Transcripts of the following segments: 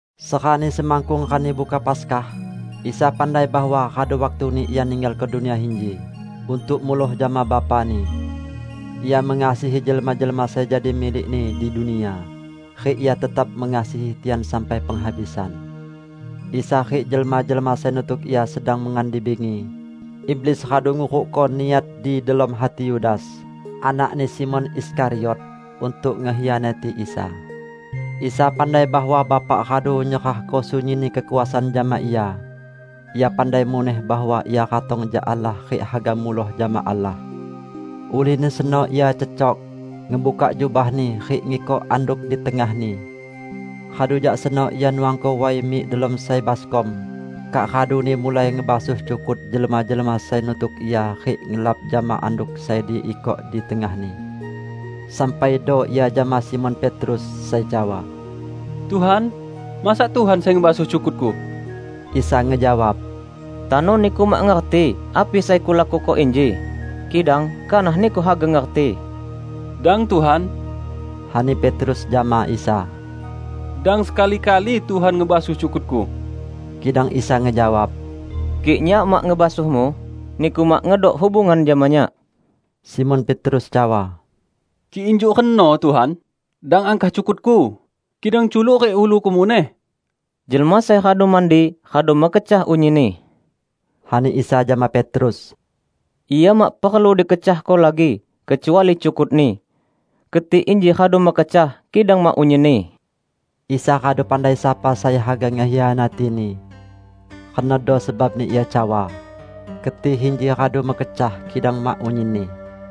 Serani semakkung Rani Buka Paskah, Isa pandai bahwa radu waktuni Ia ninggalko dunia inji untuk muloh jama Bapa-Ni. Ia mengasihi jelma-jelma sai jadi milik-Ni di dunia, rik Ia tetap mengasihi tian sampai penghabisan. Isa rik jelma-jelma sai nutuk Ia sedang mengan di bingi. Iblis radu ngurukko niat di delom hati Yudas anakni Simon Iskariot untuk ngekhianati Isa. Isa pandai bahwa Bapa radu nyerahko sunyinni kekuasaan jama Ia. Ia pandai muneh bahwa Ia ratong jak Allah rik haga muloh jama Allah. Ulihni seno Ia cecok, ngebukak jubah-Ni, rik ngikok anduk di tengah-Ni. Radu jak seno Ia nuangko way mik delom sai baskom, kak raduni mulai ngebasuh cukut jelma-jelma sai nutuk Ia rik ngelap jama anduk sai diikok di tengah-Ni. Sampaido Ia jama Simon Petrus, sai cawa, "Tuhan, masa Tuhan sai ngebasuh cukutku?" Isa ngejawab, "Tano niku mak ngerti api sai Kulakuko inji, kidang kanah niku haga ngerti." "Dang, Tuhan," ani Petrus jama Isa, "Dang sekali-kali Tuhan ngebasuh cukutku!" Kidang Isa ngejawab, "Kik Nyak mak ngebasuhmu, niku mak ngedok hubungan jama Nyak." Simon Petrus cawa, "Kik injuk reno, Tuhan, dang angkah cukutku, kidang culuk rik uluku muneh!" "Jelma sai radu mandi, radu mekecah unyinni," ani Isa jama Petrus. "Ia mak perlu dikecahko lagi; kecuali cukutni. Keti inji radu mekecah, kidang mak unyinni." ( Isa radu pandai sapa sai haga ngekhianati-Ni. Renodo sebabni Ia cawa, "Keti inji radu mekecah, kidang mak unyinni.")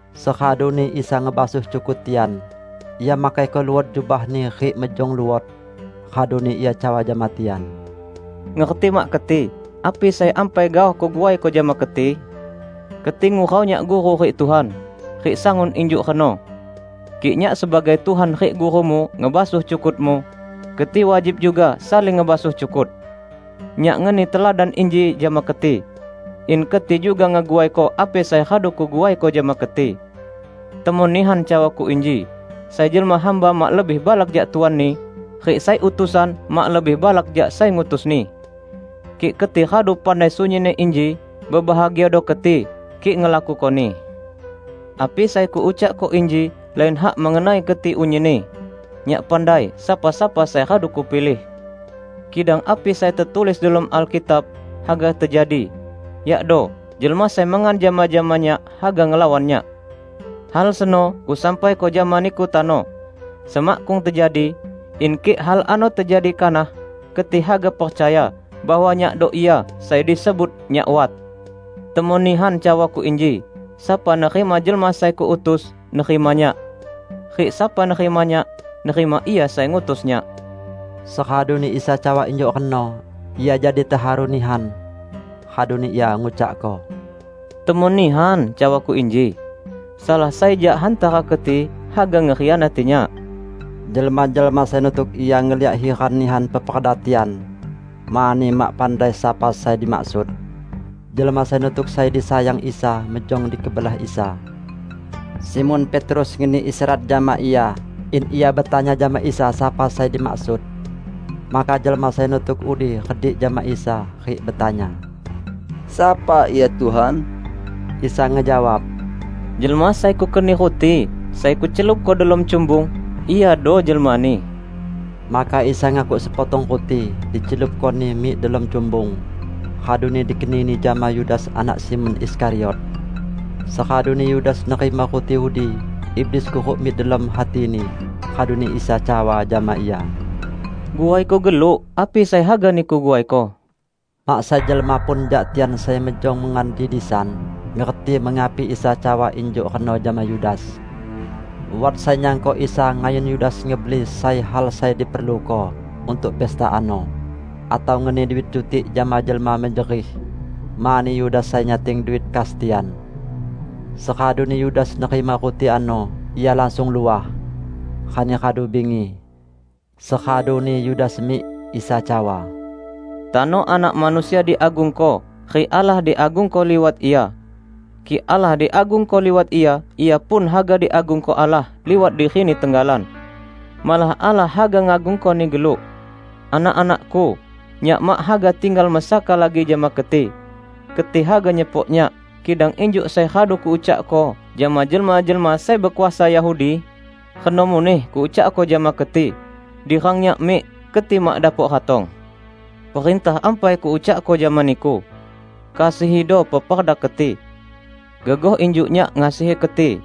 Seraduni Isa ngebasuh cukut tian, Ia makaiko luot jubah-Ni rik mejong luot. Raduni Ia cawa jama tian, "Ngerti mak keti api sai ampai gaoh Kuguaiko jama keti? Keti ngurau Nyak Guru rik Tuhan. Rik sangun injuk reno. Kik Nyak sebagai Tuhan rik Gurumu ngebasuh cukutmu, keti wajib juga saling ngebasuh cukut. Nyak ngeni teladan inji jama keti, in keti juga ngeguaiko api sai radu Kuguaiko jama keti. Temon nihan cawa-Ku inji: Sai jelma hamba mak lebih balak jak tuanni, rik sai utusan mak lebih balak jak sai ngutusni. Kik keti radu pandai sunyinni inji, bebahagiado keti kik ngelakukoni. Api sai Kuucakko inji lain hak mengenai keti unyinni. Nyak pandai sapa-sapa sai radu Kupilih. Kidang api sai tetulis delom Alkitab, haga tejadi, yakdo 'Jelma sai mengan jama-jama Nyak, haga ngelawan Nyak.' Hal seno Kusampaiko jama niku tano, semakkung tejadi, in kik hal ano tejadi kanah, keti haga percaya bahwa Nyakdo Ia sai disebut NYAK WAT. Temon nihan cawa-Ku inji: Sapa nerima jelma sai Kuutus, nerima Nyak. Rik sapa nerima Nyak, nerima Ia sai ngutus Nyak." Seraduni Isa cawa injuk reno, Ia jadi teharu nihan. Raduni Ia ngucakko, "Temon nihan cawa-Ku inji: Salah sai jak hantara keti haga ngekhianati Nyak." Jelma-jelma sai nutuk Ia ngeliak hiran nihan peperda tian mani mak pandai sapa sai dimaksud. Jelma sai nutuk sai disayang Isa mejong di kebelah Isa. Simon Petrus ngeni isyarat jama Ia, in ia betanya jama Isa sapa sai dimaksud. Maka jelma sai nutuk udi redik jama Isa, rik betanya, "Sapa ia, Tuhan?" Isa ngejawab, "Jelma sai Kukeni ruti sai Kucelupko delom cumbung, iado jelmani." Maka Isa ngakuk sepotong ruti, dicelupkoni mik delom cumbung; raduni dikenini jama Yudas anak Simon Iskariot. Seraduni Yudas nerima ruti udi, iblis kuruk mik delom hatini. Raduni Isa cawa jama ia, "Guaiko geluk api sai haga niku guaiko." Mak sai jelma pun jak tian sai mejong mengan di disan ngerti mengapi Isa cawa injuk reno jama Yudas. Wat sai nyangko Isa ngayun Yudas ngebeli sai hal sai diperluko untuk pesta ano, atau ngeni duit cutik jama jelma mejerih -- mani Yudas sai nyating duit kas tian. Seraduni Yudas nerima ruti ano, ia langsung luah. Rani radu bingi. Seraduni Yudas mik, Isa cawa, "Tano Anak Manusia diagungko, rik Allah diagungko liwat Ia. Kik Allah diagungko liwat Ia, Ia pun haga diagungko Allah liwat diri-Ni tenggalan. Malah Allah haga ngagungko-Ni geluk. Anak-anak-Ku, Nyak mak haga tinggal mesaka lagi jama keti. Keti haga nyepok Nyak, kidang injuk sai radu Kuucakko jama jelma-jelma sai bekuasa Yahudi, reno muneh Kuucakko jama keti; di rang Nyak mik, keti mak dapok ratong. Perintah ampai Kuucakko jama niku: Kasihido peperda keti. Gegoh injuk Nyak ngasihi keti,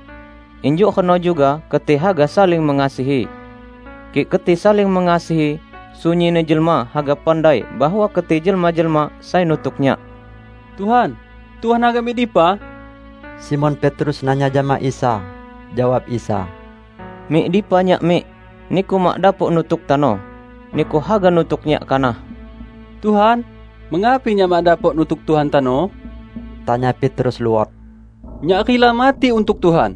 injuk reno juga keti haga saling mengasihi. Kik keti saling mengasihi, sunyinni jelma haga pandai bahwa keti jelma-jelma sai nutuk Nyak." "Tuhan, Tuhan haga mik dipa?" Simon Petrus nanya jama Isa. Jawab Isa, "Mik dipa Nyak mik, niku mak dapok nutuk tano. Niku haga nutuk Nyak kanah." "Tuhan, mengapi nyak mak dapok nutuk Tuhan tano?" tanya Petrus luot. "Nyak rila mati untuk Tuhan!"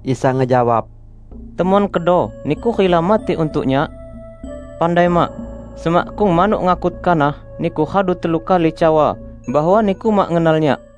Isa ngejawab, "Temon kedo niku rila mati untuk Nyak? Pandai mak, semakkung manuk ngakut kanah, niku radu telu kali cawa bahwa niku mak ngenal Nyak!"